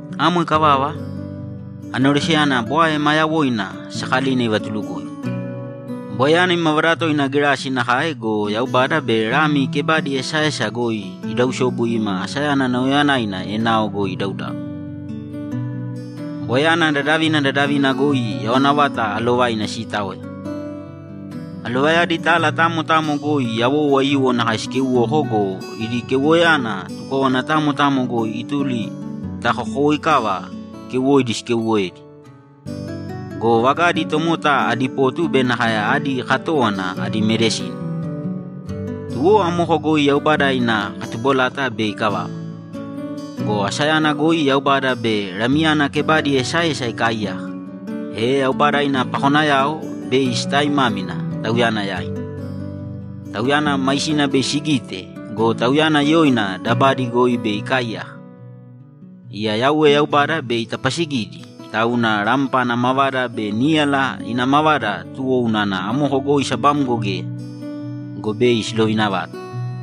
Amo ikavava, aneroseyana bwae ma yawoina sakalina ivatulukoigu; bwaeyana imavada toina gerasi nakae go, Yaubada be Lami kebadi esaesa goi idausobu ima asayana nauyayanaina enao goi idaudau. Bwaeyana dadavina dadavina goi yawana vata alovaina sitaoya. Alovayadi tala tamo tamo goi yawou aiyuwo nakae sikeuwoko go, idi keuwoyana tukówana tamo tamo goi ituli ta kokowoikava keuwoidi sikeuwoedi. Go vagadi tomota adi potu be nakae adi katówana adi medisini. Tuwo amoko goi Yaubada ina katubolata bei ikavava. Go asayana goi Yaubada be Lamiyana kebadi esaesa ikaaiyaka, e Yaubada ina pakonayao bei sitaimámina Tauyana yaina. Tauyana maisina bei sigite go, Tauyana yoina dabadi goi bei ikaaiyaka. Iya Yauwe Yaubada bei itapasigidi, tauna rampa ina mavada be níyala ina mavada tuwo unana amoko goi sabamgo geya. Go bei silovina vata.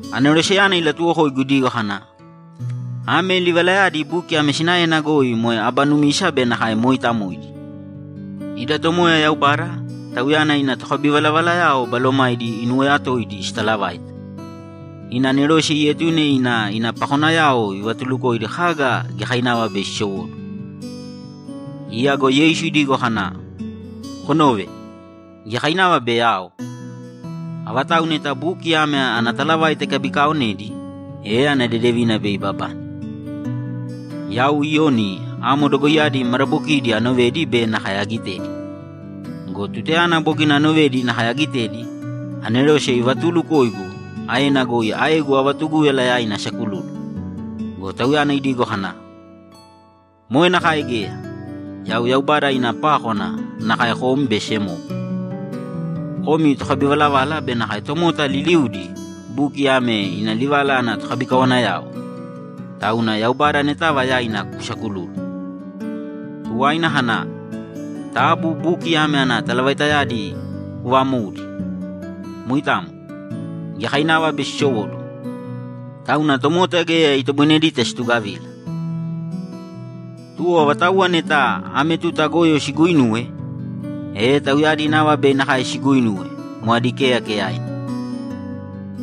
Aneroseyana ilatuwokoigu idigo kana, ‘Ame livalayadi buki ame sinaena goi moe aba numisa be nakae mooitamoidi. Ida Tomoya Yaubada, Tauyana ina tokabivalavalayao balomaidi inuwoyatoidi sitalavaita, ina anerose ietune ina ina pakonayao ivatulukoidi kaga giyakainava bei sisowóduwo.’ Iya go Yeisu idigo kana, ‘Konōve! Giyakainava bei ao! Avatau neta buki ame ana talavaita ikabikaaonedi, e ana dedevina bei ibabane.’ Yau Iyoni amo dogoiyadi madabokidi anovedi be nakae agitedi. Go tutayana bogina anovedi nakae agitedi, anerose ivatuulukoigu aena goi aegu avatugúyala yaina asakululu. Go tauyana idigo kana, ‘Moe nakae geya! Yau Yaubada ina pákwana nakae kom be semowo; komi tokabivalavala be nakae tomota liliudi buki ame ina livala ana tokabikawanayao. Tauna Yaubada anetava yaina kusakulūlu!’ Tuwaina kana, ‘Taabu buki ame ana talavaitayadi kuuvamōudi. Moitamo. Giyakainava bei sisowóduwo. Tauna tomota geya itoboinedita situgavila. Tuwo avatauwa neta ame tuta goyo siguuinuwe, e tauyadi nava bei nakae siguuinuwe; moe adi keyakeyaina.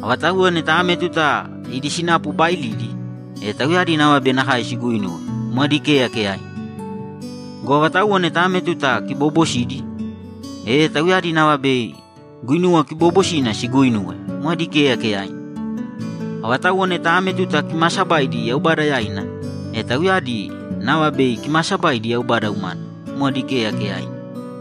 Avatauwa neta ame tuta idi sinapu baailidi, e tauyadi nava bei nakae siguuinuwe; moe adi keyakeyaina. Go avatauwa neta ame tuta kiboobosidi, e tauyadi nava bei guinuwa kiboobosina siguuinuwe; moe adi keyakeyaina. Avatauwa neta ame tuta kimaasabaidi Yaubada yaina, e tauyadi nava bei kimaasabaidi Yaubada umana; moe adi keyakeyaina.’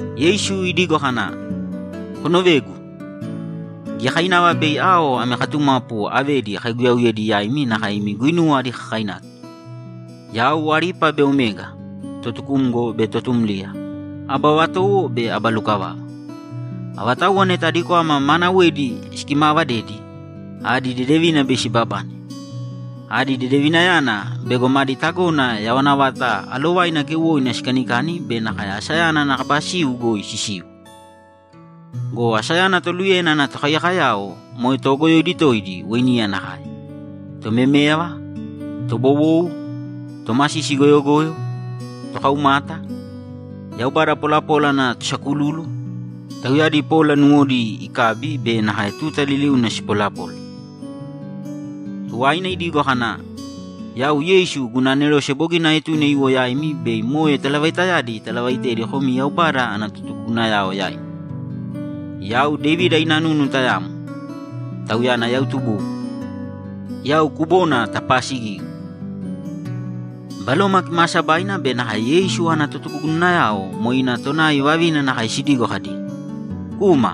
Yeisu idigo kana, ‘Konovēgu! Giyakainava bei ao ami katumapu avedi akaiguyauyedi yaimi nakae imi guinuwa adi kakainaki. Yau Alipa be Omega, Totukumgo be Totumliya, Aba vatowo be Aba lukavava. Avatauwa neta adi kwama maanawedi sikimaavadedi, adi dedevina bei sibabane. Adi dedevinayana bego madi tagona yawana vata alovaina keuwoina sikanikani be nakae asayana ana kaba siu goi sisiu. Go asayana toluyena ana tokaiyakoyao moe toogoyoidi toidi weiniya nakae, tomeméyava, tobowou, tomasisi goyogoyo, tokaumata, yaubada polapola ana tosakululu, tauyadi pola nuwodi ikabi be nakae tuta liliuna sipolapola.’ Tuwaina idigo kana, ‘Yau Yeisu guna anerose bogina aetune iwo yaimi bei moe talavaitayadi italavaitedi komi Yaubada ana totugugunayao yaimi. Yau Devida ina nunu tayamo, tauyana yau tubugu. Yau kubona tapaasigigu.’ Baloma Kimaasabaina be nakae Yeisu ana totugugunayao moe ina tonai vavina nakae sidigo kadi, ‘Kūma!’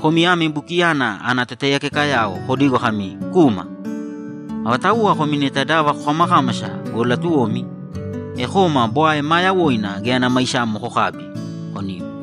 Komi ame bukiyana ana totaiyakekayao kodīgo kami, ‘Kūma!’ Avatauwa komi neta dava kokamakámasa go, latuwomi, e kōma bwae maa yawoina geya ana maisamo kokābi, konīm!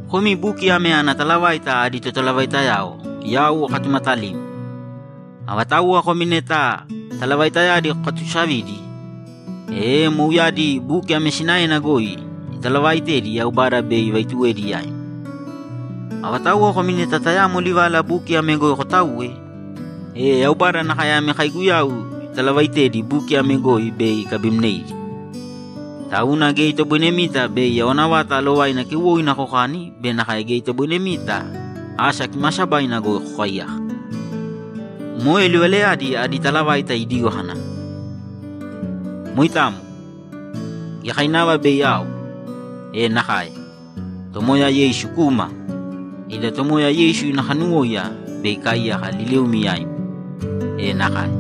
Komi buki ame ana talavaita adi totalavaitayao yau akatumatalimi. Avatauwa komi neta talavaitayadi kokatuusavidi, e mouyadi buki ame sinaena goi italavaaitedi Yaubada bei ivaituwedi yaimi. Avatauwa komi neta tayamo livala buki ame goi kotauwe, e Yaubada nakae ami kaiguyau italavaitedi buki ame goi bei ikabimneidi, tauna geya itoboinemita bei yawana vata alovaina keuwoina kokani be nakae geya itoboinemita asa kimaasabaina goi kokaiyaka. Moe livalayadi adi totalavaita idigo kana, ‘Moitamo! Giyakainava bei ao!’ E nakae! Tomoya Yeisu, kūma! Ida Tomoya Yeisu ina kanuwóiya bei ikaaiyaka liliumi yaimi. E nakae!